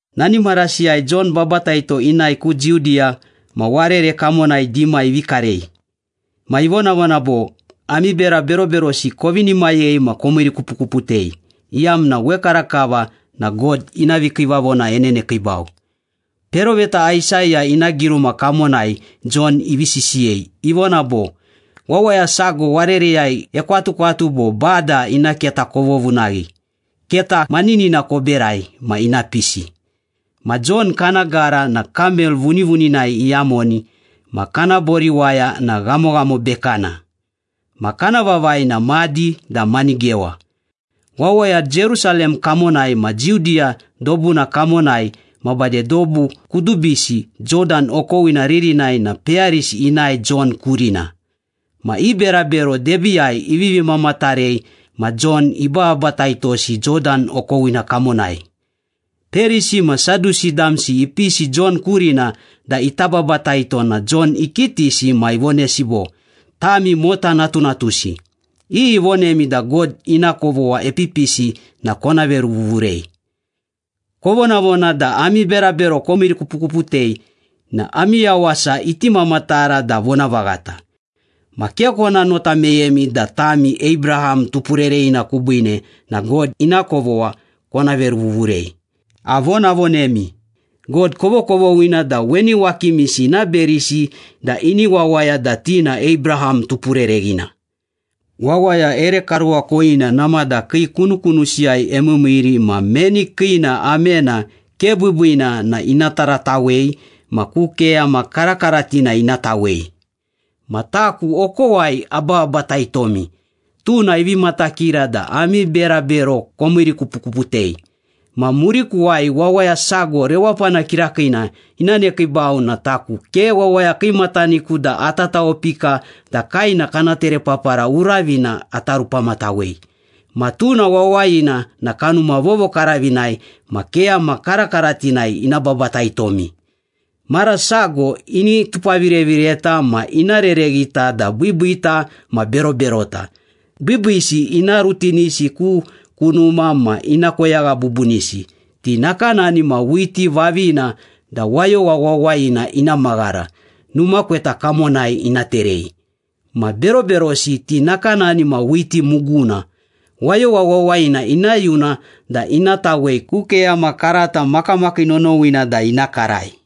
Nani marasiyai Jon Babataito inae ku Judiya ma warere kamonai dima ivi karei. Ma ivonavona bo, “Ami bera beroberosi kovinimayei ma komiirikupukuputei, iyamna wekarakava na God ina vikiivavona enenekiibau.” Peroveta Aisaya ina giruma kamonai Jon ivi sisiyei. Ivona bo, “Wawaya sago warereyai ekwatukwatu bo, ‘Bada ina keta kovovunaghi, Keta maninina koberai ma ina pisi.’” Ma Jon kana gara na kamel vunivuninai iyamoni ma kana boriwaya na ghamoghamo bekana. Ma kana vavai na madi da manigewa. Wawaya Jerusalem kamonai ma Judiya dobuna kamonai ma bade dobu kudubisi Jodan okowina ririnai na peyarisi inae Jon kurina. Ma i berabero debiiyai ivivi mamatarei ma Jon ibababataitosi Jodan okowina kamonai. Perisi ma Sadusi damsi ipisi Jon kurina da ita babataito na Jon ikitisi ma ivonesi bo, “Tami mota natunatusi! Iyi ivonemi da God ina kovogha epipisi na kona veruvuvurei? Kovonavona da ami berabero komiirikupukuputei na ami yawasa iti mamatara da vonavaghata. Ma ke kona nota meyemi da tami Abraham tupurereghina kubiine na God ina kovogha kona veruvuvurei. Avonavonemi, God kovokovoghina da weni wakimisi ina berisi da ini wawaya da ti na Abraham tupurereghina. Wawaya ere karuwakoyina namada kii kunukunusiyai emiimiiri ma meni kiina amena ke biibiina na ina taratawei ma ku keyama karakaratina ina tawei. Ma taku okowai abababataitomi, tuna ivi matakira da ami berabero komiirikupukuputei. Ma murikuwai wawaya sago rewapana kirakiina ina nekiibau na taku ke wawaya kiimataniku da ata tawopika da kaena kana terepapara uravina ata rupamatawei. Ma tuna wawayina na Kanuma Vovokaravinai ma keyama karakaratinai ina babataitomi. Mara sago ini tupavirevireta ma ina rereghita da biibiita ma beroberota. Biibiisi ina rutinisi ku kunuma ma ina koyagha bubunisi. Ti nakanani ma whiti vavina da wayowa wawayina ina maghara, numa kweta kamonai ina terei. Ma beroberosi ti nakanani ma whiti muguna. Wayowa wawayina ina yuna da ina tawei ku keyama karata makamakii nonowina da ina karai.”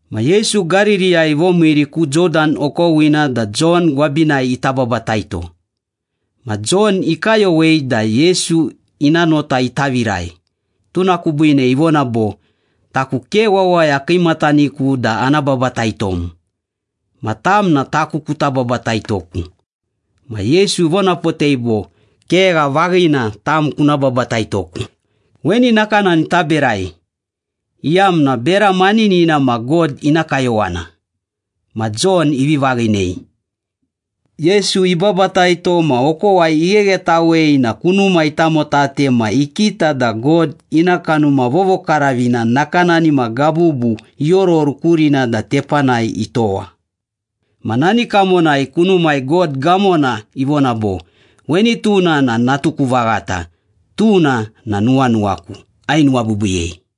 Ma Yesu Gaririyai ivomiiri ku Jodan okowina da Jon gwabinai ita babataito. Ma Jon ikayowei da Yesu ina nota ita virai, tuna kubiine ivona bo, “Taku ke wawaya kiimataniku da ana babataitom. Ma tam na taku kuta babataitoku.” Ma Yesu ivonapotei bo, “Kegha vaghina, tam kuna babataitoku. Weni nakanani taberai, iyamna bera maninina ma God ina kayowana.” Ma Jon ivi vaghinei. Yesu ibabataito ma okowai igheghetawei na kunuma itamotate ma ikita da God ina Kanuma Vovokaravina nakanani ma gabubu iororu kurina da tepanai itowa. Ma nani kamonai kunumai God gamona ivona bo, “Weni tuna na natuku vaghata. Tuna na nuwanuwaku, ainuwabiibiiyei.”